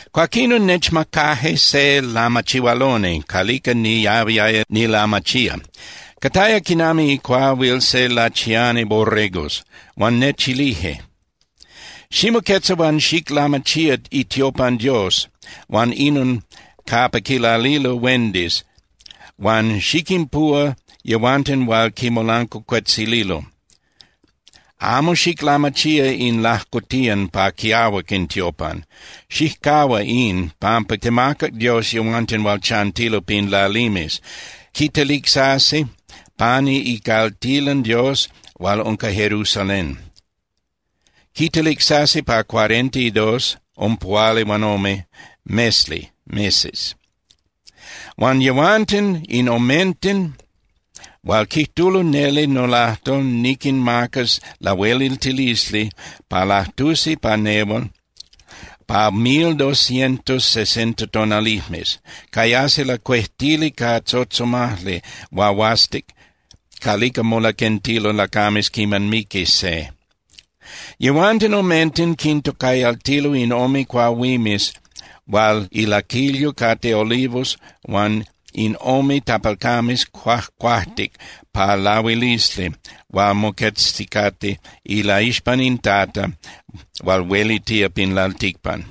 Cuaquinon nechmacaje se lamachihualoni calica niahuiaya nilamachía. Cataya quinami icuahuil se ilachiani borregos. Huan nechilije: —Ximoquetza huan xiclamachía itiopan Dios huan inon capa quilalilo huendis huan xiquinpuhua yehuanten hual quimolancuacuetzililo. Amo xiclamachía in lajcotiyan pa quiahuac in tiopan. Xijcahua in, pampa temacac Dios yehuanten hual chantilo pin lalimes, quitelicsasi pani icaltilan Dios hual unca Jerusalén. Quitelicsasi pa cuarenta y dos (ompuhualihuanome) mesli (meses). Huan yehuanten in omenten hual quijtulo neli nolajtol niquinmacas lahueliltilisli pa lajtusi pa nehual pa mil doscientos sesenta tonalijmes. Cayasi lacuejtili ca tzotzomajli huahuastic calica molaquentilo lacames quiman miqui se. Yehuanten omenten quintocayaltilo in ome cuahuimes hual ilaquilyo cate olivos huan in ome tapalcames cuajcuajtic pa lahuilisli hual moquezticate ilaixpan in Tata hual huelitía pin lalticpan.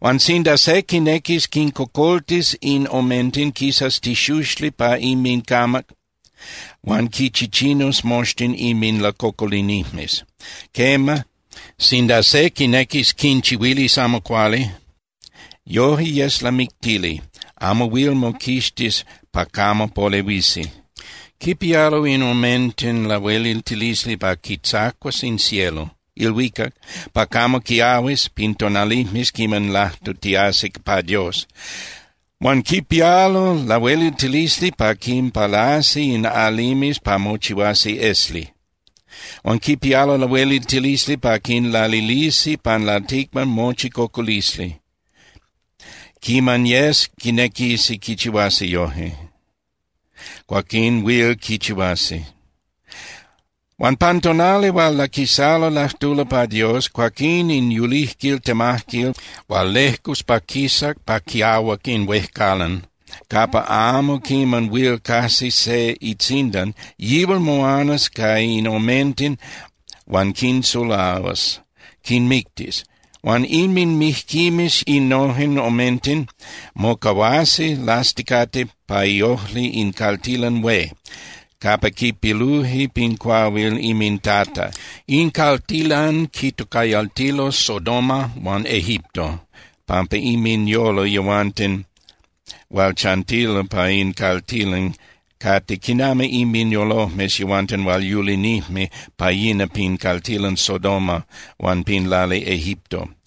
Huan sinda se quinequis quincocoltis in omenten, quisas tixuxli pa inmincamac huan quichichinus moxtin inminlacocolinijmes. Quema, sinda se quinequis quinchihuilis amo cuali, yoje yes lamictili, amo huil moquixtis pa camo polehuisi. Quipialo in omenten lahueliltilisli pa quitzacuas in cielo (ilhuicac) pa camo quiahuis pin tonalijmes quiman lajtutiasi pa Dios. Huan quipialo lahueliltilisli pa quinpalasi in alimes pa mochihuasi esli. Huan quipialo lahueliltilisli pa quinlalilisi pan lalticpan mochi cocolisli. Quiman yes quinequisi quichihuasi yojque, cuaquín huil quichihuasi. Huan pan tonali hual laquisalo lajtulo pa Dios, cuaquín in yulijquil temajquil hual lejcus pa quisas pa quiahuac in huejcalan capa amo quiman huil cajsi se itzindan, yihual moanas ca in omenten huan quinsulahuas, quinmictis. Huan inminmijquimes innojen omenten mocahuasi lasticate pa iojli in caltilan hué capa quipiluje pin cuahuil inminTata. In caltilan quitocayaltilo Sodoma huan Egipto pampa inminyolo yehuanten hual chantilo pa in caltilan cate quinami inminyolojmes yehuanten hual yulinijme pa yina pin caltilan Sodoma huan pin lali Egipto.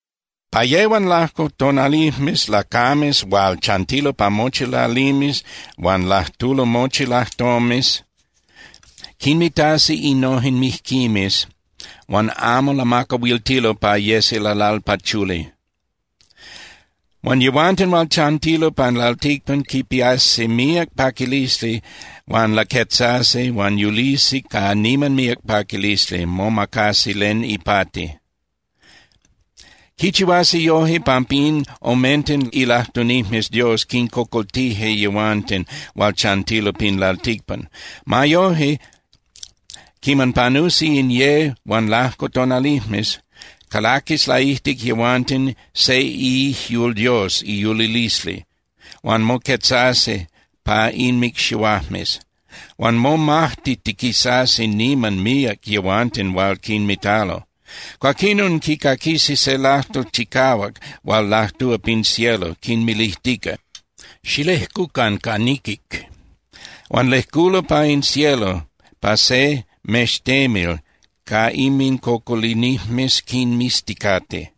Pa ye huan lajco tonalijmes lacames hual chantilo pa mochi lalimes huan lajtulo mochi lajtomes quinmitasi innojen mijquimes huan amo lamacahuiltilo pa yesi lalalpachuli. Huan yehuanten hual chantilo pan lalticpan quipiasi míac paquilisli huan laquetzasi huan yulisi ca niman míac paquilisli, momacasi len ipati. Quichihuasi yoje pampa in omenten ilajtunijmes Dios quincocoltije yehuanten hual chantilo pin lalticpan. Ma yoje, quiman panusi in ye huan lajco tonalijmes, calaquis laijtic yehuanten se iijyul Dios iyulilisli, huan moquetzasi pa inmicxihuajmes. Huan momajtitiquisasi niman míac yehuanten hual quinmitalo. Cuaquinon quicaquisi se lajtol chicahuac hual lajtúa pin cielo quinmilijtica: —¡Xilejcucan ca niquic! Huan lejculo pa in cielo pa se mextemil ca inmincocolinijmes quinmizticate.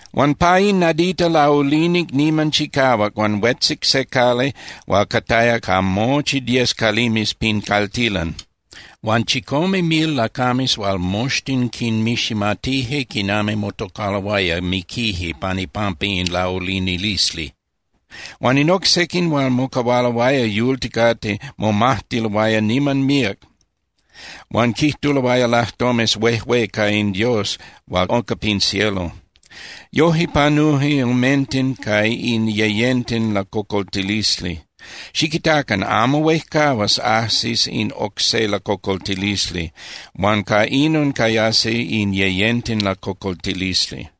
Huan pa in nadita laulinic niman chicahuac huan huetzic se cali hual cataya ca mochi diez calimes pin caltilan. Huan chicome mil lacames hual moxtin quinmiximatije quinami motocaloaya miquije pan ipampa in laulinilisli. Huan in oc sequin hual mocahualoaya yulticate momajtiloaya niman míac huan quijtuloaya lajtomes huejué ca in Dios hual unca pin cielo. Yoje panuje omenten ca in yeyenten lacocoltilisli. Xiquitacan. Amo huejcahuas ajsis in oc se lacocoltilisli huan ca inon cayasi in yeyenten lacocoltilisli.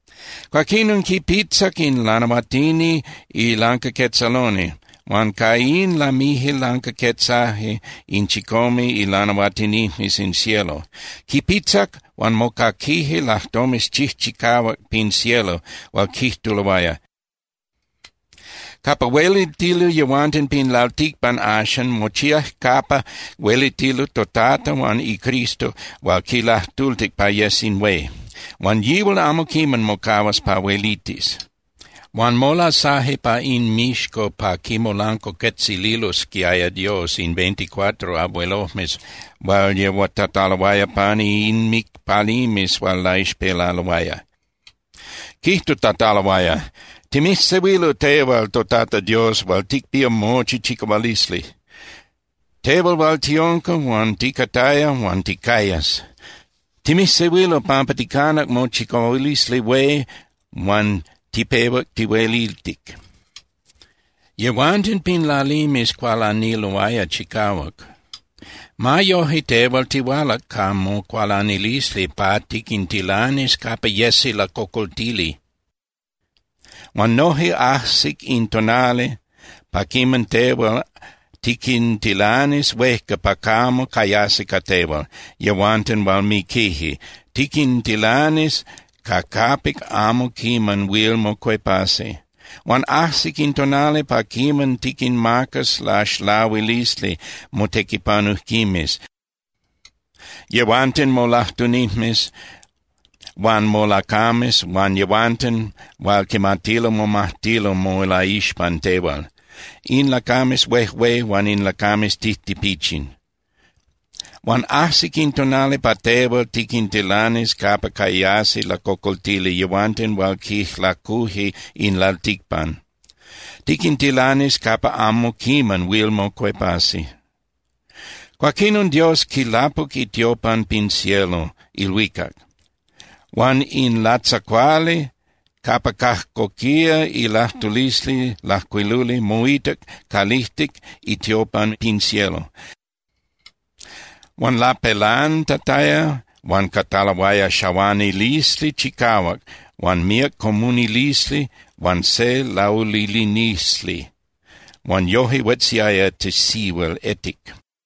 Cuaquinon quipitzac in lanahuatini ilancaquetzaloni huan ca in lamije lancaquetzaje in chicome ilanahuatinijmes in cielo. Quipitzac huan mocaquije lajtomes chijchicahuac pin cielo hual quijtuloaya: Capa huelitilo yehuanten pin lalticpan axan mochíac capa huelitilo toTata huan iCristo hual quilajtultic pa yes in hué. Huan yihual amo quiman mocahuas pa huelitis. Huan molasaje pa inmixco pa quimolancuacuetzililosquiaya Dios in veinticuatro abuelojmes hual yehuatataloaya pani inmicpalimes hual laixpelaloaya. Quijtutataloaya: Timijsehuilo tehual toTata Dios hual ticpía mochi chicahualisli, tehual hual tiunca huan ticataya huan ticayas. Timijsehuilo pampa ticanac mochicahualisli hué huan tipehuac tihuelitic. Yehuanten pin lalimes cualaniloaya chicahuac. Ma yoje, tehual tihualac ca mocualanilisli pa tiquintilanis capa yesi lacocoltili. Huan noje ajsic in tonali pa quiman tehual tiquintilanis huejca pa camo cayasi ca tehual yehuanten hual miquije, tiquintilanis ca capic amo quiman huil mocuepasi. Huan ajsic in tonali pa quiman tiquinmacas laxlahuilisli motequipanujquimes, yehuanten molajtunijmes huan molacames huan yehuanten hual quimatilo momajtilo molaixpan tehual, in lacames huejué huan in lacames tijtipichin. Huan ajsic in tonali pa tehual tiquintilanis capa cayasi lacocoltili yehuanten hual quijlacuje in lalticpan. Tiquintilanis capa amo quiman huil mocuepasi. Cuaquinon Dios quilapuc itiopan pin cielo (ilhuicac). Huan in latzacuali capa cajcoquía ilajtulisli lajcuiluli moitac calijtic itiopan pin cielo. Huan lapelantataya huan cataloaya xahuanilisli chicahuac huan míac comunilisli huan se laulinilisli. Huan noje huetziaya tisihuil etic.